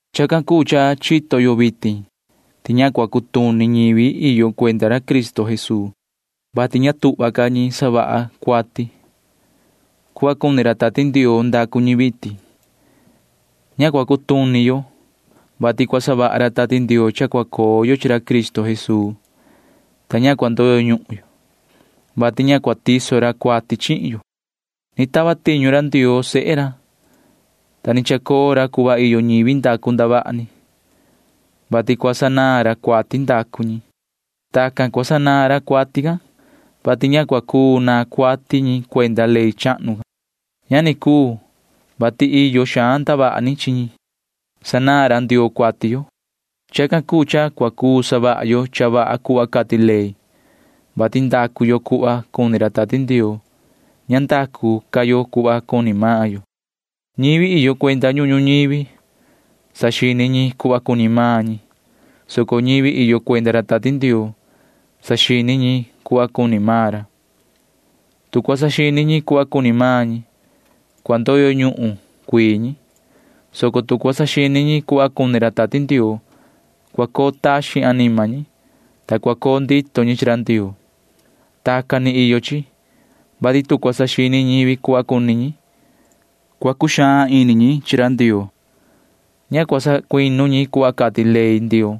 Chacan cuu cha chito yo vitin ti ña cua cutuni ñivi iyo cuenda ra Cristo Jesuu, vati ña tuhva ca ñi savaha ñi cuati. Cuhva cuni ra Tati Ndioo ndacu ñi vitin. Ña cua cutuni yo, vati cua savaha ra Tati Ndioo cha cua coo yo chi ra Cristo Jesuu, ta ña cua ndoyo ñuhun yo, vati ña cua tiso ra cuati chihin yo. Ni tava tiñu ra Ndioo sehe ra, ta ni chacoo ra cuhva iyo ñivi ndacu ndavaha ni, vati cua sanaan ra cuati ndacu ñi. Tacan ni cua sanaan ra cuati can, vati ña cuu naan cuati ñi cuenda ley chahnu can. Ña ni cuu, vati iyo xaan ndavaha ni chi ñi. Sanaan ra Ndioo cuati yo. Chacan cuu cha cua cuu savaha yo cha vaha cuhva cati ley, vati ndacu yo cuhva cuni ra Tati Ndioo. Ña ndacu ca yo cuhva cuni maan yo. Ñivi iyo cuenda ñuhun ñuñivi―saxini ñi cuhva cuni maan ñi, soco ñivi iyo cuenda ra Tati Ndioo―saxini ñi cuhva cuni maan ra. Tu cua saxini ñi cuhva cuni maan ñi, cua ndoyo ñuhun cuii ñi, soco tu cua saxini ñi cuhva cuni ra Tati Ndioo, cua coo taxin anima ñi, ta cua coo ndito ñi chi ra Ndioo. Tacan ni iyo chi, vati tu cua saxini ñivi cuhva cuni ñi, cua cuxaan ini ñi chi ra Ndioo. Ña cua sacuinu ñi cuhva cati ley Ndioo,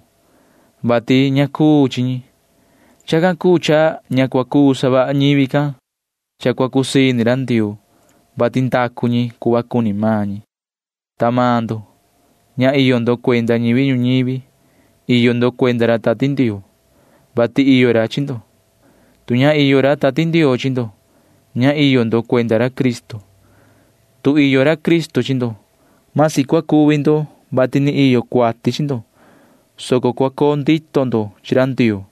vati ña cuu chi ñi. Chacan cuu cha ña cua cuu savaha ñivi can cha cua cusii ini ra Ndioo, vati ndacu ñi cuhva cuni maan ñi. Ta maan ndo―ña iyo ndo cuenda ñivi ñuñivi. Iyo ndo cuenda ra Tati Ndioo, vati iyo ra chi ndo. Tu ña iyo ra Tati Ndioo chi ndo, ña iyo ndo cuenda ra Cristo. Tu iyo ra Cristo chi ndo, masi cua cuvi ndo, vati ni iyo cuati chi ndo, soco cua coo ndito ndo chi ra Ndioo,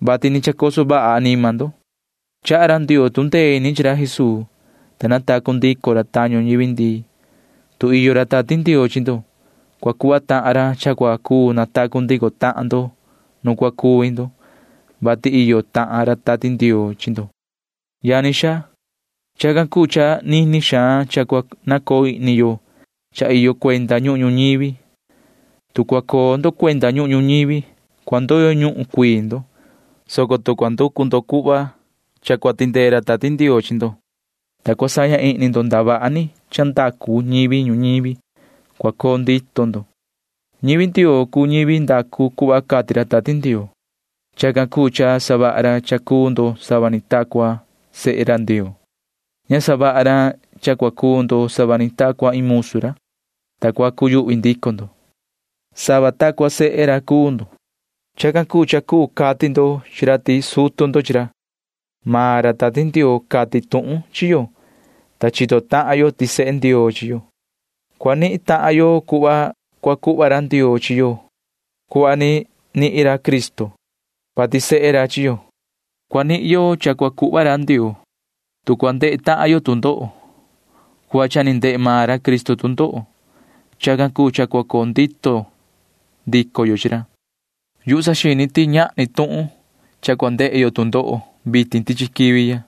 vati ni chacoso vaha anima ndo. Chaha ra Ndioo tu ndee ini chi ra Jesuu, ta natacu ndico ra tañu ñivi ndii. Tu iyo ra Tati Ndioo chi ndo, cua cuhva tahan ra cha cua cuu natacu ndico tahan ndo nu cua cuvi ndo, vati iyo tahan ra Tati Ndioo chi ndo. Yani xaa, chacan cuu cha nini xaan cha cua nacoo ihni yo cha iyo cuenda ñuhun ñuñivi. Tu cua coo ndo cuenda ñuhun ñuñivi, cua ndoyo ñuhun cuii ndo, soco tu cua nducu ndo cha cua tindee ra Tati Ndioo chi ndo, ta cua saña ihni ndo ndavaha ni cha ndacu ñivi ñuñivi, cua coo ndito ndo. Ñivi Ndioo cuu ñivi ndacu cuhva cati ra Tati Ndioo. Chacan cuu cha savaha ra cha cuu ndo sava ni ta cua sehe ra Ndioo. Ña savaha ra cha cua cuu ndo sava ta cua iin musu ra, ta cua cuyuhvi ndico ndo. Sava ta cua sehe ra cuu ndo. Chacan cuu cha cuu cati ndo chi ra ti sutu ndo chi ra. Ini ra Tati Ndioo cati tuhun chi yo, ta chito tahan yo ti sehe Ndioo chi yo. Cua nihin tahan yo cuhva cua cuhva ra Ndioo chi yo cuhva ni nihin ra Cristo, vati sehe ra chi yo. Cua nihin yo cha cua cuhva ra Ndioo, tu cua ndehe tahan yo tu ndoho cuhva cha ni ndehe maan ra Cristo tu ndoho. Chacan cuu cha cua coo ndito ndico yo chi ra. Yuhu saxini ti ñahni tuhun cha cua ndehe yo tu ndoho vitin tichi quivi ya.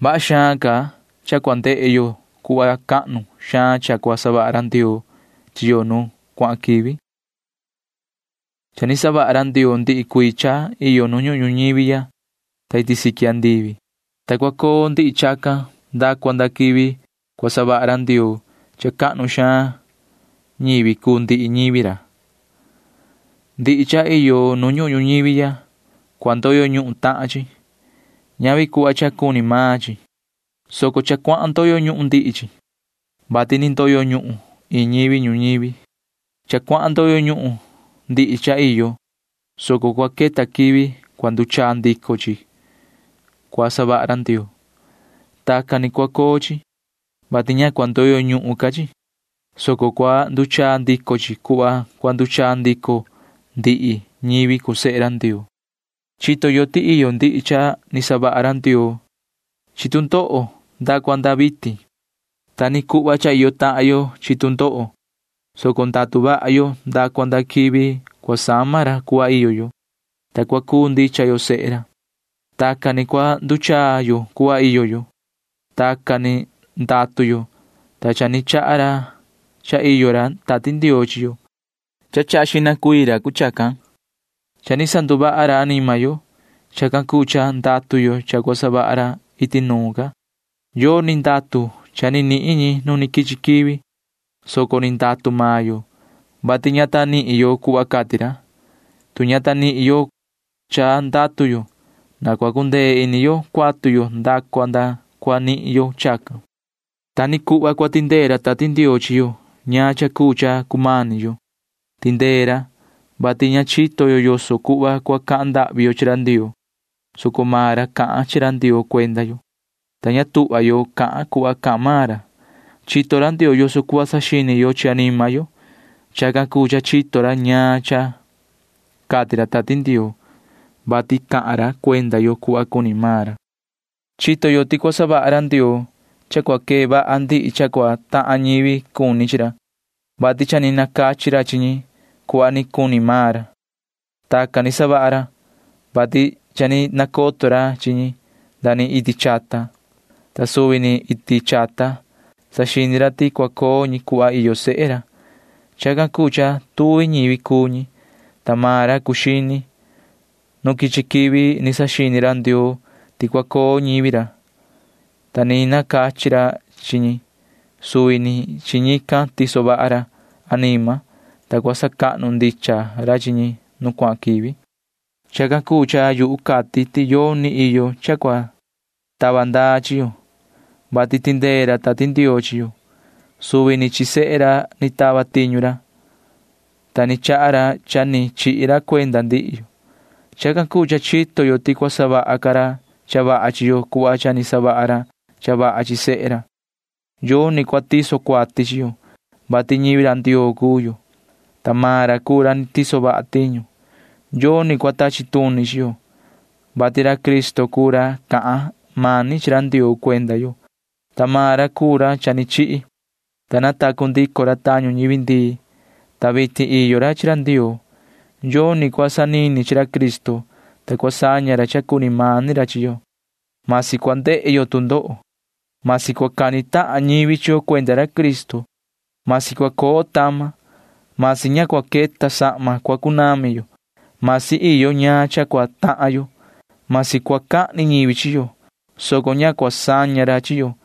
Vaha xaan ca cha cua ndehe yo cuhva cahnu xaan cha cua savaha ra Ndioo chi yo nu cuahan quivi. Cha ni savaha ra Ndioo ndihi cuii cha iyo nu ñuhun ñuñivi ya ta iti siqui andivi, ta cua coo ndihi chacan nda cua nda quivi cua savaha ra Ndioo cha cahnu xaan ñivi cuu ndihi ñivi ra. Ndihi cha iyo nu ñuhun ñuñivi ya―ndoyo ñuhun tahan chi. Ñavi cuhva cha cua coo xihna cuu chacan, soco cha cuahan ndoyo ñuhun ndihi chi, [vati ni ndoyo ñuhun iin ñivi ñuñivi]. Cha cuahan ndoyo ñuhun ndihi cha iyo, soco cua queta quivi cua nduchaa ndico chi cua savaha ra Ndioo. Tacan ni cua coo chi, vati ña cua ndoyo ñuhun ca chi, soco cua nduchaa ndico chi cuhva cua nduchaa ndico ndihi ñivi cuu sehe ra Ndioo. Chito yo ti iyo ndihi cha ni savaha ra Ndioo chi tu ndoho nda cua nda vitin. Ta ni cuhva cha iyo tahan yo chi tu ndoho, soco ndatu vaha yo nda cua nda quivi cua sama ra cuhva iyo yo, ta cua cuu ndicha yo sehe ra. Tacan ni cua nduchaa yo cuhva iyo yo. Tacan ni ndatu yo, ta cha ni chaha ra cha iyo ra Tati Ndioo chi yo. Cha ni chaha xihna ra cuu chacan. Cha ni sanduvaha ra anima yo. Chacan cuu cha ndatu yo cha cua savaha ra iti nuun ca. Yoni ndatu cha ni nihin ñi nu ni quichi quivi, soco ni ndatu maan yo, vati ña ta nihin yo cuhva cati ra. Tu ña ta nihin yo cha ndatu yo, na cua cundee ini yo cuatu yo nda cua nda cua nihin yo chacan. Ta ni cuhva cua tindee ra Tati Ndioo chi yo ñaan cha cuu cha cumani yo. Tindee ra, vati ña chito yo yoso cuhva cua cahan ndahvi yo chi ra Ndioo, soco maan ra cahan chi ra Ndioo cuenda yo, ta ña tuhva yo cahan yo cuhva cahan maan ra. Chito ra Ndioo yoso cuhva saxini yo chi anima yo. Chacan cuu cha chito ra ñaan cha cati ra Tati Ndioo, vati cahan ra cuenda yo cuhva cuni maan ra Ndioo. Chito yo ti cua savaha ra Ndioo cha cua quee vaha ndihi cha cua tahan ñivi cuni chi ra, vati cha ni nacachi ra chi ñi cuhva ni cuni maan ra. Tacan ni savaha ra, vati cha ni nacoto ra chi ñi nda ni iti chata, ta suvi ni iti chata saxini ra ti cua coo ñi cuhva iyo sehe ra. Chacan cuu cha tuvi ñivi cuu ñi, ta maan ra cuu xini. Nu quichi quivi ni saxini ra Ndioo ti cua coo ñivi ra, ta ni nacachi ra chi ñi. Suvi ni chi ñican tiso vaha ra anima, ta cua sacahnu ndicha ra chi ñi nu cuahan quivi. Chacan cuu cha yuhu cati ti yoni iyo cha cua tava ndaa chi yo, vati tindee ra Ndioo chi yo. Suvi ni chi sehe ra ni tava tiñu ra, ta ni chaha ra cha ni chihi ra cuenda ndihi yo. Chacan cuu cha chito yo ti cua savaha ca ra cha vaha chi yo cuhva cha ni savaha ra cha vaha chi sehe ra. Yoni cua tiso cuati chi yo, vati ñivi ra Ndioo cuu yo, ta maan ra cuu ra ni tiso vaha tiñu. Yoni cua tachi tuni chi yo, vati ra Cristo cuu ra cahan mani chi ra Ndioo cuenda yo, ta maan ra cuu ra cha ni chihi, ta natacu ndico ra tañu ñivi ndii, ta vitin iyo ra chi ra Ndioo. Yoni cua cuu sanini chi ra Cristo, ta cua saña ra cha cuni mani ra chi yo. Vasi cua ndehe yo tu ndoho. Vasi cua cani tahan ñivi chi yo cuenda ra Cristo. Vasi cua coo tama. Vasi ña cua queta sahma cua cunami yo. Vasi iyo ñaan cha cua tahan yo. Vasi cua cahni ñivi chi yo, soco ña cua saña ra chi yo.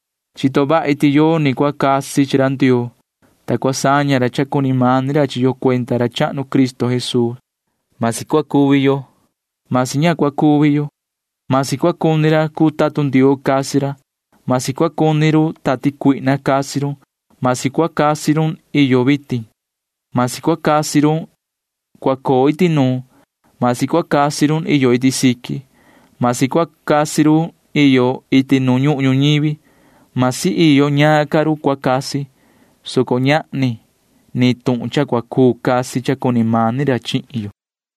Chito vahi ti yoni cua cuu casi chi ra Ndioo, ta cua saña ra cha cuni mani ra chi yo cuenda ra chahnu Cristo Jesuu. Vasi cua cuvi yo. Vasi ña cua cuvi yo. Vasi cua cuni casi ra cuu tatun Ndioo. Vasi cua cuni casi run tati cuihna. Vasi cua cuni casi run iyo vitin. Vasi cua cuni casi run cua coo iti nuun. Vasi cua cuni casi run iyo iti siqui. Vasi cua cuni casi run iyo iti nu ñuhun ñuñivi. Vasi iyo ñaan ca run cua cuni casi, soco ña ta ñahni ni iin run cua cuu casi cha cuni mani ra chihin yo.